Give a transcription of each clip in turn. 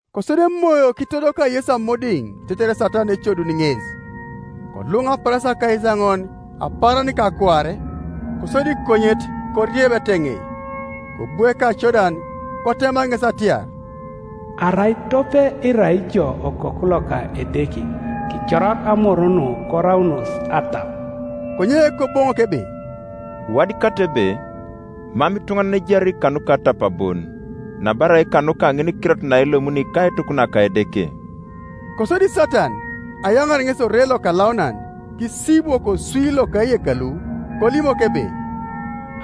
Kosodi Emoyo kitodoka Yesu amodiŋ tetere Satan ecoduni ŋes. Koluŋ apaarasia akaisaoŋon apaaran ka akuare, kosodi konyet korieb eteŋei. Kobu ekacodan, kotema ŋes atiar, “Arai tope irai ijo Okoku loka Edeke, kicorak amor nu koraunos atap.” Konye Koboŋok ebe, “Iwadikatai ebe, Mam ituŋanan ejari kanuka atap bon, nabarai kanuka ŋinikirot naelomuni kaituk naka Edeke.” Kosodi Satan ayaŋaar ŋes ore lokalaunan; kisibwo koswi loka eyekalu, kolimok ebe,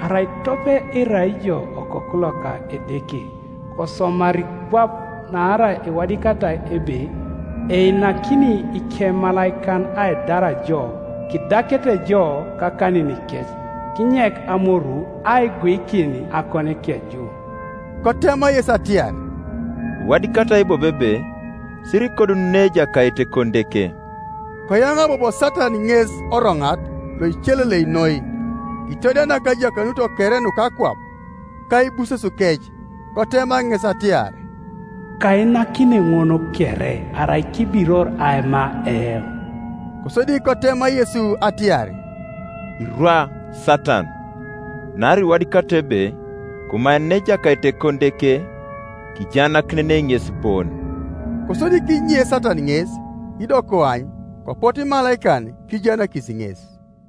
“Arai tope irai ijo Okoku loka Edeke, kosomari kwap: naarai iwadikatai ebe, Einakini ikemalaikan aidar jo, Kidakete jo kakaninikec, Kinyek amoru aiguikin akonikeju.” Kotema Yesu atiar, “Iwadikatai bobo ebe, Sirikodununei Ejakait Ekonideke.” Koyaŋa bobo Satan ŋes oroŋat loicelelei noi, kitodianak ajakanuto kere nuka akwap, ka aibusesukec; kotema ŋes atiar, “Kainakini ŋun kere, arai kibiror aima eoŋ.” Kosodi kotema Yesu atiar, “Irwa, Satan; naarai iwadikatai ebe, Komaenenei Ejakait Ekonideke, Kijaanakinenei ŋes bon.” Kosodi kinye Satan ŋes; ido koany, kopotu imalaikan kijaanakis ŋes.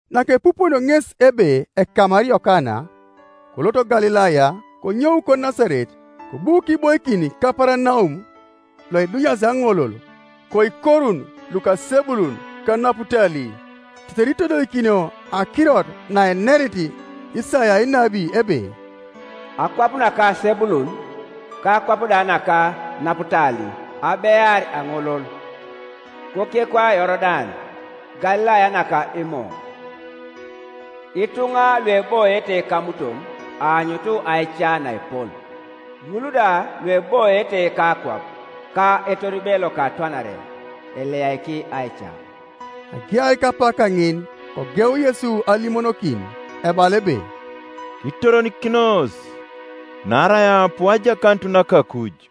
Nakepupunio ŋes ebe ekamar Yokana, kolot Galilaya; konyou koNasaret, kobu kiboikin Kaparanaum, loidunyas aŋolol, koikorun luka Sebulun ka Naputali, tetere itodolikinio akirot naenerit Isaia enabi ebe, “Akwap naka Sebulun, ka akwap naka Naputali, Abear aŋolol, kokekwa Yorodan, Galilaya naka Imo. Ituŋa lueboiete kamuton, Aanyut aica naepol, ŋul da lueboiete kakwap ka etoribe loka atwanare, Eliyaiki aica.” Agear kapak kaŋin kogeu Yesu alimonokin, ebala ebe, “Kitoronikinos; naarai aapu ajakanut naka akuj.”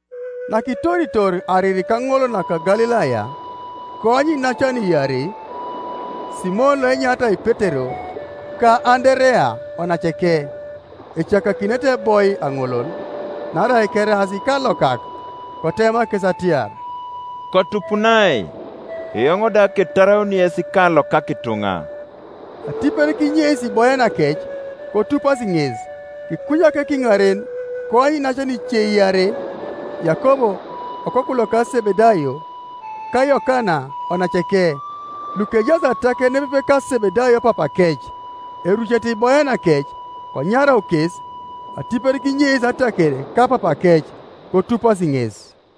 Nakitoritor ariri kaŋolol naka Galilaya, koany iinacan iarei, Simon loenyaritai Petero, ka Anderea onaceke, ecakakinete eboi aŋolol; naarai keraas ikalokak. Kotema kes atiar, “Kotupunai, eoŋ da ketaraun yes ikalokak ituŋa.” Atipet kinyeis iboyanakec, kotupasi ŋes. Kikunyak kiŋaren koany iinacan ice iarei, Yakob okoku loka Sebedayo, ka Yokana onaceke, lukejaas ataker nepepe ka Sebedayo papakec, erucete iboyanakec; konyarau kes. Atipet kinyeis ataker ka papakec, kotupasi ŋes.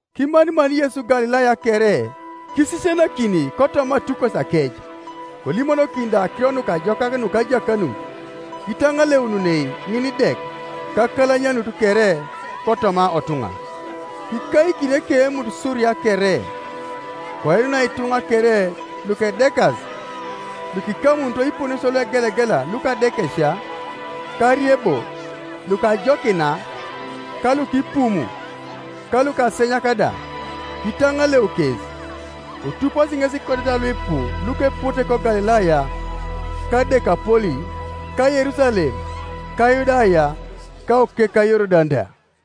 Kimanimani Yesu Galilaya kere, kisisianakini kotoma atukosiakec, kolimonokini da akiro nukajokak nuka ajakanut, kitaŋaleununei ŋinidek, ka akalanyanut kere kotoma otuŋa. Kikaikin ekeemut Suria kere: koinunai ituŋa kere lukedekas, lukikamunito iponesio luegelegela luka adekesia, ka ariebo, lukajokina, ka lukipumu, ka lukasenyak da; kitaŋaleu kes. Kotupasi ŋes ikodeta luipu lukepote koGalilaya ka Dekapoli, ka Yerusalem, ka Yudaya, ka okekwa Yorodan da.